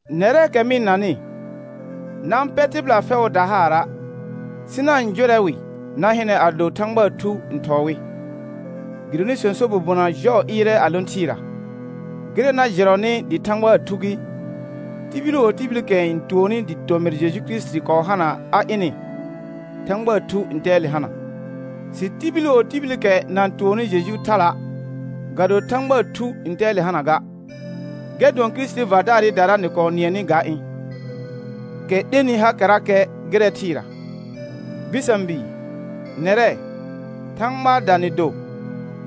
Nɛrɛɛkɛ mɩ-n nanɩ, na-n pɛ tɩbɩla fɛʋʋda haara', sɩ na-n jʋrɛ wɩ na hɩnɛ ado Thãgbaa Thu n thɔɔ wɩ, gɩdonɩ sõso bobona jɔɔ ɩɩrɛ a lõ thɩɩra. Gɩrɛ na jɩrɔnɩ dɩ Thãgbaa Thu gɩ: Tibil wo tibilikɛ n tuonni dɩ tomɩr Jeju Kirisiti kɔɔ hana a ɩnɩ, Thãgbaa Thu ntɛɛle hana. Sɩ tibil wo tibilikɛ na-n tuonni Jeju thala', ga do Thãgbaa Thu ntɛɛle hana ga, gɛr dʋɔn Kirisitii vardaarɩdara nɩ kɔɔ nɩɛnɩ ga ɩ̃, kɛ 'lenɩ hakɛrakɛ gɩrɛ thɩɩra. Bɩsã bii, nɛrɛ, Thãgbaada nɩ do,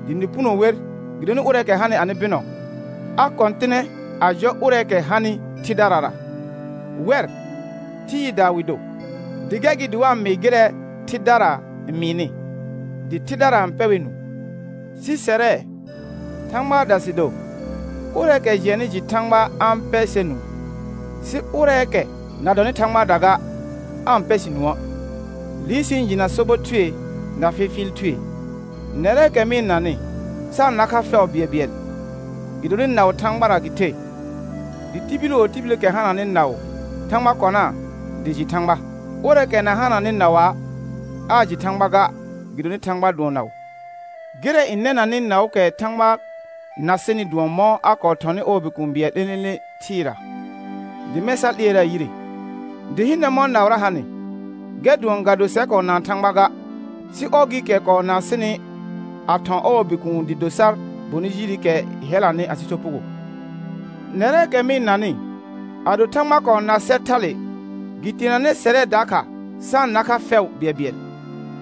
dɩ nɩ puno wer, gɩdonɩ ʋrɛɛkɛ hanɩ anɩ bɩnɔ a kɔ̃tɩnɛ a jɔ ʋrɛɛkɛ hanɩ thɩdarara. Wɛr, thɩɩda wɩ do, gɛr gɩ dɩ wa-n mɩɩ gɩrɛ thɩdara n mɩɩnɩ, dɩ thɩdara n pɛ wɛr nũu. Sɩ sɛrɛ, Thãgbaada sɩ do. Ʋrɛɛkɛ jɩɛnnɩ jɩ Thãgba a-n pɛ sɛr nũu, sɩ ʋrɛɛkɛ na dɔnɩ Thãgbaada ga, aa-n pɛ sɩ nũə'; liir sɩ-n jɩna sobɔ thue na fɩfɩɩl thue. Nɛrɛɛkɛ mɩ-n nanɩ, sa-n na kha fɛʋ bɩɛlbɩɛl, gɩdonɩ naʋ Thãgbara gɩ the, dɩ tibil wo tibilikɛ hananɩ naʋ, Thãgba kɔnaa dɩ jɩ Thãgba. Ʋrɛɛkɛ na hananɩ naʋa', aa jɩ Thãgba ga, gɩdonɩ Thãgba dʋɔn naʋ. Gɩrɛ n nɛnanɩ naʋʋkɛ Thãgba na sɩnɩ dʋɔn mɔ̃ a kɔɔ thɔnɩ ɔɔ Bikũu bɩɛl 'lẽ'lẽ'lẽ thɩɩra, dɩ mɛ̃ sa 'lɩɛraa yire. Dɩ hɩnɛ mɔ̃ naʋra hanɩ, gɛr dʋɔn ga do sɛr kɔɔ naan Thãgba ga, sɩ ɔr gɩɩkɛ kɔɔ naan sɩnɩ a thɔ̃ ɔɔ Bikuun dɩ do sar bonɩ jirikɛ hɛlanɩ asɩ sopugo. Nɛrɛɛkɛ mɩ-n nanɩ, ado Thãgba kɔɔ na sɛr thale, gɩ teenanɛ sɛrɛ dakha sa-n na kha fɛʋ bɩɛlbɩɛl.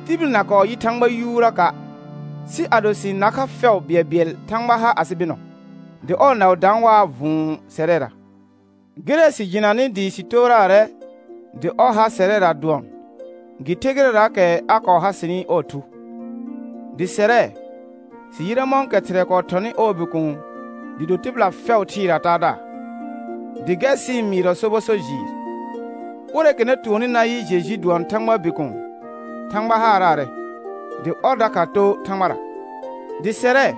Tibil na kɔɔ yɩ Thãgba yuuraka', sɩ ado sɩ-n nar kha fɛʋ bɩɛlbɩɛl Thãgba har asɩ bɩnɔ, dɩ ɔɔ naʋ daan waa vʋ̃ʋ sɛrɛra. Gɩrɛ sɩ jɩnanɩ dɩ sɩ tooraarɛ dɩ ɔr ha sɛrɛra dʋɔn gɩ ther gɩrɛraakɛ a kɔɔ ha sɩnɩ ɔɔ Thu. Dɩ sɛrɛ, sɩ yɩrɛ mɔ̃kɛ Thɩrɛ kɔɔ thɔnɩ ɔɔ Bikuun dɩ do tɩbɩla fɛʋ thɩɩraa Taadaar, dɩ gɛr sɩ-n mɩɩrɔ sobɔ so jɩɩr. Ʋrɛɛkɛ na tuonni nayɩ Jeju dʋɔn Thãgbaa Bikuun, Thãgba haaraarɛ, dɩ ɔr dakha too Thãgbara. Dɩ sɛrɛ,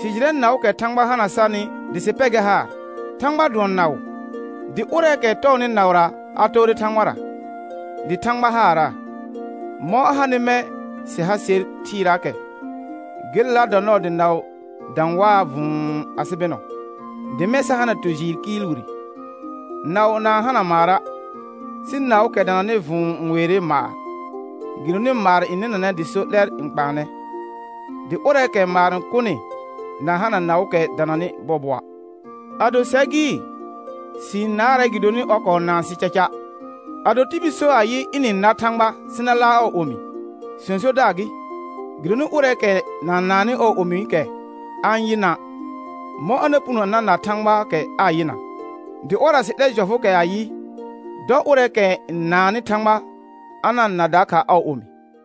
sɩ jɩrɛ naʋʋkɛ Thãgba hana sarnɩ dɩ sɩ pɛ gɛr haar. Thãgba dʋɔn naʋ, dɩ ʋrɛɛkɛ tɔɔnɩ naʋra a toore Thãgbara, dɩ Thãgba haaraa. Mɔ̃ a hanɩ mɛ̃ sɩ ha ser thɩɩraakɛ, gelela dɔ nɔɔ dɩ naʋ dã waa vʋ̃ʋ asɩ bɩnɔ, dɩ mɛ̃ sa hana tu jɩɩr kɩɩl wire. Naʋ na-n hana maara', sɩ naʋʋkɛ dananɩ vʋ̃ʋ n weere maar, gɩdonɩ maar n nɩnanɛ dɩ so 'lɛr n kpaanɛ, dɩ ʋrɛɛkɛ maar n kʋnɩ na hana naʋʋkɛ dananɩ bɔɔbɔa'. Ado sɛr gɩ, sɩ-n naarɛ gɩdonɩ ɔr kɔɔ naan sɩ caca. Ado tibil so ayɩ, ɩnɩ-n nar Thãgba, sɩ na laar ɔɔ omi, sõsodaar gɩ; gɩdonɩ ʋrɛɛkɛ na-n naannɩ ɔɔ omiikɛ a-n yɩna', mɔ̃ a na puno a na na Thãgbaakɛ aa yɩna? Dɩ ɔrra sɩ 'lɛ jɔfʋʋkɛ ayɩ: Dɔ ʋrɛɛkɛ n naannɩ Thãgba a na-n na dakha ɔɔ omi.